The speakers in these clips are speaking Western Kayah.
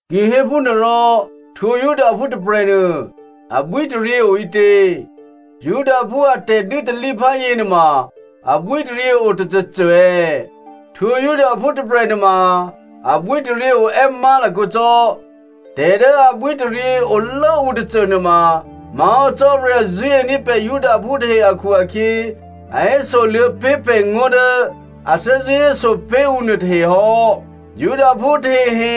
Ki hé phúnuôrò, htwǒ Judaphú tôprè̤nuô abwítaryě oǐtě? Judaphú a tè̤dû́talíphá yěnuôma abwítaryě otôcôcô è̌? Htwǒ Judaphú tôprè̤ nuôma abwítaryě oè́ má̤lakǒ cò́. Tè̤dố abwítaryě olốǔ tôcô nuôma má̤hò́ Cò́marya zṳ̂́ení̤ pè̤ Judaphú tahe akhu-akhyě, a hésoluô̌ pé̤ pè̤ngó̤ dố a thè́zṳ̂́ héso pé̤ ǔ nuôtahe hò́. Judaphú tahehe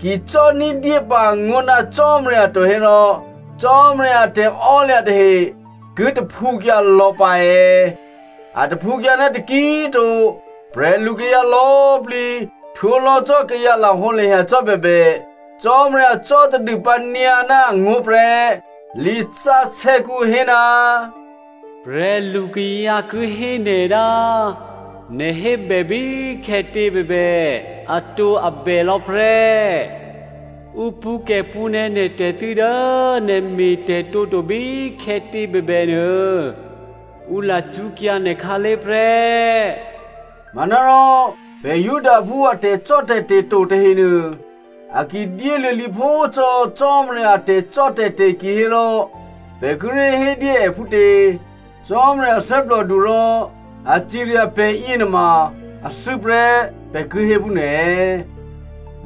ki cò́ ní̤dyé pǎ angó̤ ná Cò́marya to hérò, Cò́marya a tè̤ò́lya̤ tahe ki taphǔkyǎ lò̌ pǎ è̌? A taphǔkyǎ ná taki꤮ to. Prè̤lukayǎ lò̌꤮ plǐ htwǒlò̌ cò́ kayǎ lahǒlahya cò́ bèbè, Cò́marya cò́ tadûpǎ nyǎ ná angó̤ prè́. Lisǎsè̌kǔ hé, “Prè̤lukayǎ ki hé nè̤ ná nè̤ hébè bíkhè̌tě꤮ bèbè atǒabè lò̌ prè́, ǔ pṳ̌kè̤pṳ̌nè̌ nè̤ tè̤thû́ dố nè̤ me̤tè̤tǒto bíkhè̌tě꤮ bèbè nuô, ǔ lacṳ́kyǎ nè̤ khǎlé̤ prè́.” Manárò pè̤ Judaphú a tè̤cò́tè̤te̤ to tahenuô a ki dyéluô̌ lǐphó cò́ Cò́marya a tè̤cò́tè̤te̤ kihérò pè̤ kíré̤ hédyé è phútě? Cò́marya thè́plòdu rò a cirya pè̤yě nuôma athû́ prè́, pè̤ ki hé phúnuô è̌?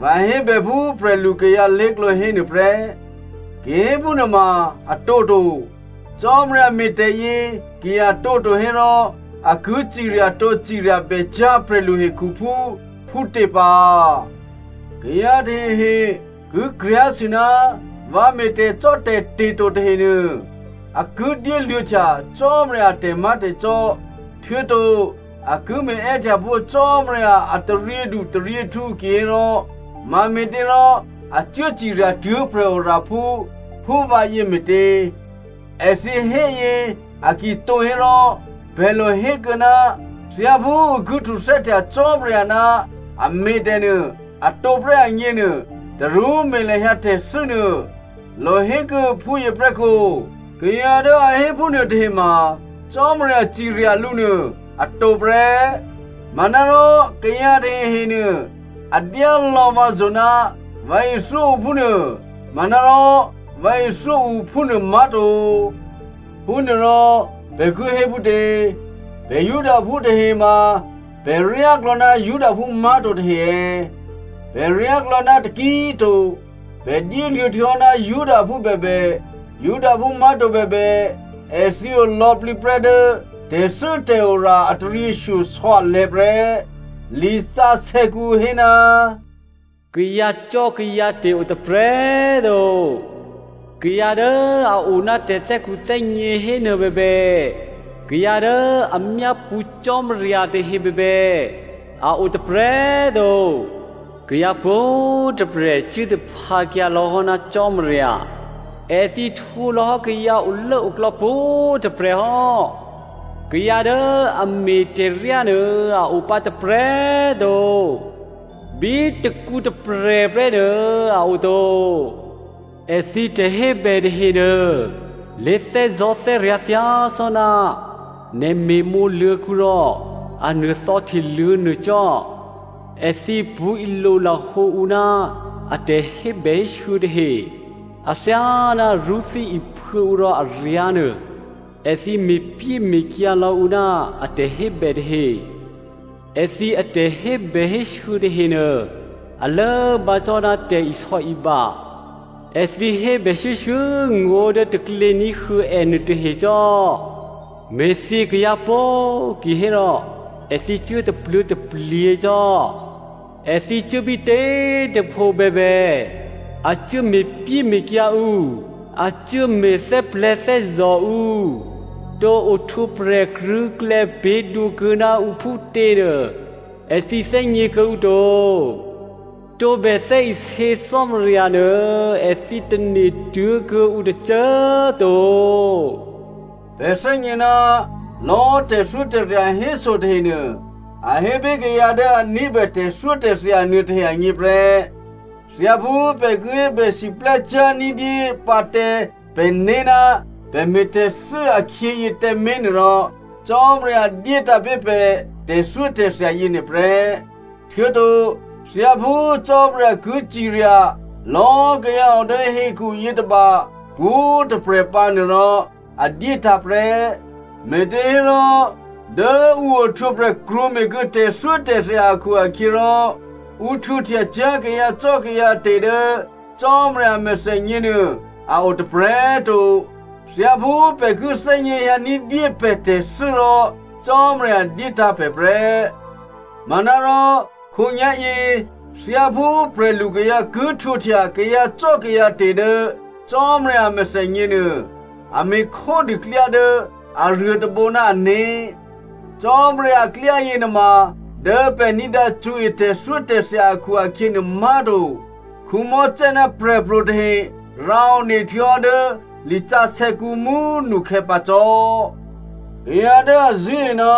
(Vǎ hébè phú prè̤lukayǎ lé̤klǒ hénuô prè́.) Ki héphúnuôma a tǒto. Cò́marya me̤tè̤yě ki a tǒto hérò a ki ciryatǒ ciryabècyá̤ prè̤lu hekhuphú phútě pǎ? Kayǎ tahehe ki kryá̤sû, “Vǎ me̤ tè̤cò́tè̤te̤ to tahenuô, a ki dyéluô̌htya Cò́marya a tè̤má̤tè̤cò́, htuô̌to a ki me̤ è́htyapó̤ Cò́marya a taryědutaryěhtǔ kihérò, mame̤těrò a cuố ciryatuố̤ prè̤oraphú, phú vǎyě me̤tě?” Èthǐ héyě a ki tǒ hérò, pè̤ lohékuô̌, “Thyáphú ǔ ki htuthè́htya Cò́marya ná a me̤tè̤ nuô a tǒprè́ agněnuô, tarú me̤ lahyǎ tè̤thû́nuô,” lohékuô̌ phúyěprè́kǒ. Kayǎ dố a hé phúnuô tahema Cò́marya cirya lǔ nuô a tǒprè́. Manárò kayǎ tahehenuô a dyá lò̌ vǎzo̤ ná vǎ ithyó ǔ phúnuô. Manárò vǎ ithyó ǔ phúnuô má̤to. Phúnuôrò, pè̤ ki hé phútě? Pè̤ Judaphú tahe ma pè̤ ryáklò̌ ná Judaphú má̤to tahe è̌? Pè̤ ryáklò̌ ná taki꤮ to. Pè̤ dyéluô̌ htuô̌hò́ ná Judaphú bèbè, Judaphú má̤to bèbè èthǐ olò̌plǐ prè́ dố tè̤thû́tè̤ora a taryěshyosò̌ alè̤̌ prè́. Lisǎsè̌kǔ hé, “Kayǎcò́kayǎte̤ o tôprè̤꤮ to. Kayǎ dố a o ná tè̤thè́khuthè́gně hénuô bèbè, kayǎ dố a myápṳ̌ Cò́marya tahe bèbè, a o tôprè̤꤮ to. Kayǎ pwǒ̤꤮ tôprè̤ cuố taphǎkyǎ lò̌hò́ ná Cò́marya. Èthǐ htwǒlò̌hò́ kayǎ olốoklò̌ pwǒ̤꤮ tôprè̤ hò́. Kayǎ dố a me̤ tè̤ryá nuô a opǎ tôprè̤꤮ to, bí tôkǔ tôprè̤prè́ nuô, a oto. Èthǐ tè̤hébè tahenuô, lé̤thè́zò̤́thè́ryǎ̤ thyácò́ná nè̤ me̤mǒ luô̤̌kǔ rò a nuô̤thò̌ hteluô̌ nuô cò́. Èthǐ pṳ̌ ilolahǒ ǔ ná a tè̤hébèhésû̌ tahe. Athyáná rṳ́thí iphuô̌ ǔ rò aryǎ̤ nuô, èthǐ me̤pyéme̤kyǎ lò̌ ǔ ná a tè̤hébè tahe. Èthǐ atè̤hébèhésû̌ tahenuô, a lốbǎ cò́ ná tè̤isò̌iba. Èthǐ hébè shuô̌shuô̌ ngó̤ dố taklě ní̤huô̌ ènuô tahe cò́. Me̤thyě kayǎ pó꤮ kihérò èthǐ cuố tapluố̤taplyě cò́. Èthǐ cuố bítě꤮ tôpho bèbè, a cuố me̤pyéme̤kyǎ ǔ, a cuốme̤ thè́plè̤̌thè́zò̤ ǔ. Tǒ ohtwǒprè̤ krṳ̂̌klè̌ pě̤dwǒkuô̌ ná ǔ phútěnuô, èthǐ thè́gně kuô̌ǔ to. Tǒbè thè́isě Cò́marya nuô èthǐ tane̤ tuố̤kuô̌ǔ tôcô꤮ to.” Pè̤ thè́gně ná lò̌ tè̤thyótè̤thya héso tahenuô, a hé pé̤ kayǎ dố a ní̤bè tè̤thyótè̤thya nuôtahe agněprè́. Thyáphú pè̤ ki hébè siplè́cyá̤ ní̤dyé pǎ tǎ pè̤né̤ ná pè̤ me̤ tè̤thû́ akhyěyě tǎmé̤ nuôrò, Cò́marya dyétǎ̤ pé̤ pè̤ tè̤thyótè̤thya yěnuô prè́. Htuô̌to thyáphú Cò́marya ki cirya lò̌꤮ kayǎ o dố hekhu yětôba pwǒ̤꤮ tôprè̤ pǎ nuôrò, a dyétǎ̤ prè́. Me̤těhérò, dố ǔ ohtwǒprè̤ krwǒme̤kuô̌ tè̤thyótè̤thya akhu-akhyěrò, ǔ htwǒhtyacyá̤ kayǎcò́kayǎte̤ dố Cò́marya a mèthènyě nuô a o tôprè̤꤮ to. Thyáphú pè̤ ki thè́gněhyǎ ní̤dyé pè̤ tè̤thû́ rò Cò́marya dyétǎ̤ pè̤ prè́. Manárò khǒnyá̤yě, thyáphú prè̤lukayǎ ki htwǒhtya kayǎcò́kayǎte̤ dố Cò́marya a mèthènyě nuô, a me̤ khódû klyá dố aruô tôbǒ ná ané̤. Cò́marya aklyáyě nuôma dố pè̤ ní̤dǎ cṳ̌e tè̤thyótè̤thya akhu-akhyě nuô má̤to. Mosè ná prè̤pro̤ tahe rǎone htuô̌hò́ dố lisǎsè̌kǔ mú꤮ nukhè̌ pǎ cò́. Kayǎ dố a zṳ̂́e ná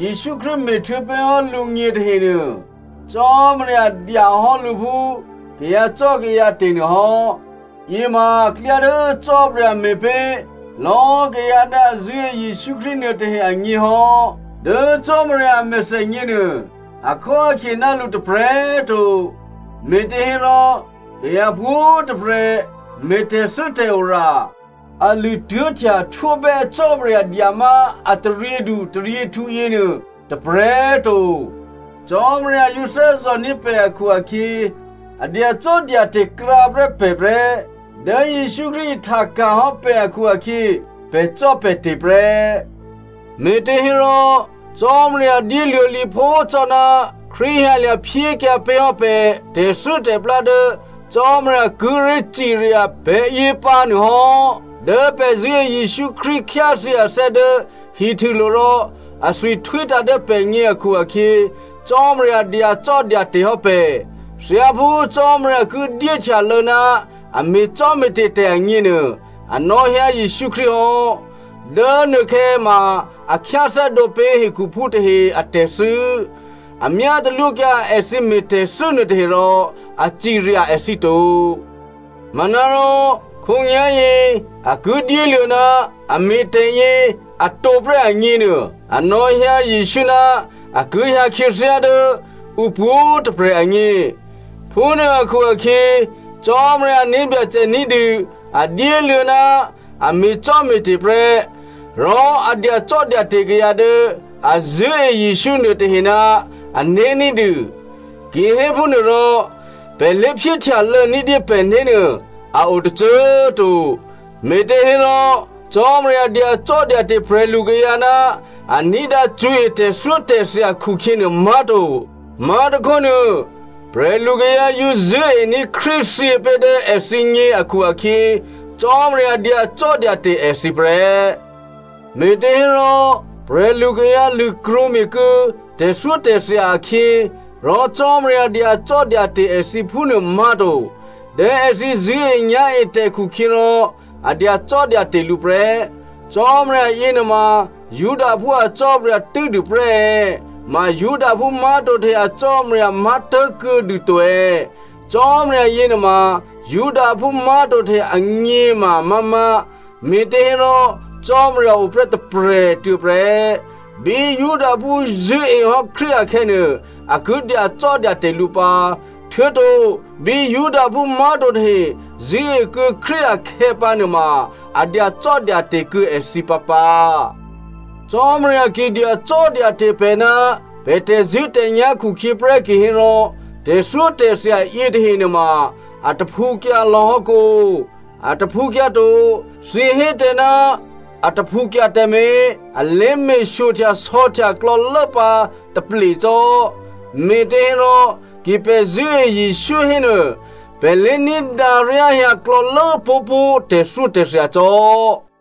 Jesǔ Krístu me̤htuô̌ pé̤hò́ lǔgně tahenuô, Cò́marya dya hò́ lǔ phú kayǎcò́kayǎte̤ nuôhò́. Yěma klyá dố Cò́marya me̤pé̤ lò̌꤮ kayǎ dố a zṳ̂́e Jesǔ Krístu nuôtahe agně hò́. Dố Cò́marya a mèthènyěnuô akhóakhye ná lǔ tôprè̤꤮ to. Me̤těhérò kayǎ pwǒ̤꤮ tôprè̤ me̤ tè̤thû́tè̤ora. A lṳ̂ tuố̤htya htwóbè́ Cò́marya dyamá a taryědutaryěhtǔ yěnuô tôprè̤꤮ to. Cò́marya yǒ thè́zò̤ní̤ pè̤ akhu-akhyě, a dyacò́dyate̤ krǎprè́ pè̤ prè́. Dố Jesǔ Krístu ihtaka̤ hò́ pè̤ akhu-akhyě, pè̤cò́pè̤te̤ prè́. Me̤těhérò Cò́marya dyéluô̌ lǐphó cò́ ná Krístu hyǎlya̤ phyékyǎ pé̤hò́ pè̤ tè̤thû́tè̤plá dố Cò́marya kíré̤ cirya pè̤yě pǎ nuô hò́. Dố pè̤ zṳ̂́e Jesǔ Krístu khyáthyě athè́ dố hihtûlo̤ rò athwi htwítǎ̤ dố pè̤gně akhu-akhyě, Cò́marya dyacò́dyate̤ hò́ pè̤. Thyáphú Cò́marya ki dyé htyaluô̌ ná a me̤cò́me̤te̤ tè̤ agněnuô, a nò̌hyǎ Jesǔ Krístu hò́. Dố nuôkhè̌ ma, a khyáthè́dǒ pé̤ hekhuphú tahe a tè̤thû́. A myá talwókyǎ èthǐ me̤ tè̤thû́ nuôtahe rò a cirya èthǐ to. Manárò khǒnyá̤yě a ki dyéluô̌ ná a me̤ tè̤yě atǒ prè́ agněnuô a nò̌hyǎ Jesǔ ná a ki hyǎ khyáthyě dố ǔ pwǒ̤꤮ tôprè̤ agně. Phúnuô akhu-akhyě, Cò́marya ané̤ Byacè ní̤dû a dyéluô̌ ná a me̤cò́me̤te̤ prè́, rò a dyacò́dyate̤ kayǎ dố a zṳ̂́e Jesǔ nuôtahe ná ané̤ ní̤dû. Kihéphúnuôrò, pè̤ lé̤phyéhtyalô̌ ní̤dyé pè̤né̤ nuô a o tôcô꤮ to. Me̤těhérò Cò́marya dyacò́dyate̤ prè̤lukayǎ ná a ní̤dǎ cṳ̌e tè̤thyótè̤thya khukhyě nuô má̤to. Má̤tôkhónuô, prè̤lukayǎ yǒ zṳ̂́ení̤ Krístu thyě pé̤ dố èthǐgně akhu-akhyě, Cò́marya dyacò́dyate̤ èthǐ prè́. Me̤těhérò prè̤lukayǎ lṳ̂krwǒme̤ kuô̌ tè̤thyótè̤thya akhyě rò Cò́marya dyacò́dyate̤ èthǐ phúnuô má̤to. Dố èthǐ zṳ̂́enyá̤etè̤ khukhyěrò, a dyacò́dyate̤ lǔ prè́. Cò́marya yěnuôma Judaphú a Cò́marya tû́dûprè́ è̌? Ma Judaphú má̤to tahe a Cò́marya má̤tố̤kuô̌ dûto è̌? Cò́marya yěnuôma Judaphú má̤to tahe agně꤮ ma amá̤má̤. Me̤těhérò Cò́marya oprè́ tôprè̤꤮ tuô̌ prè́. Bí Judaphú zṳ̂́ehò́ Krístu akhè̌nuô, a ki dyacò́dyate̤ lǔ pǎ. Htuô̌to, bí Judaphú má̤to tahe zṳ̂́ekuô̌ Krístu akhè̌pǎnuôma꤮, a dyacò́dyate̤ kuô̌ èthǐ pǎpǎ. Cò́marya ki dyacò́dyate̤ pè̤ ná pè̤ tè̤zṳ̂́tè̤nyá̤ khukhyě prè́ kihérò tè̤thyótè̤thya yětahe nuôma a taphǔkyǎ lò̌hò́ kǒ? A taphǔkyǎ to. Thǐ hé tǎ ná a taphǔkyǎ tǎmé̤, a lé me̤ shyohtyasò̌htya klò̌lố pǎ taplécò́, me̤těhérò ki pè̤ zṳ̂́e Jesǔ hénuô pè̤ lé ní̤dǎ ryáhyǎ klò̌lố pó̤pó̤ tè̤thyótè̤thya cò́.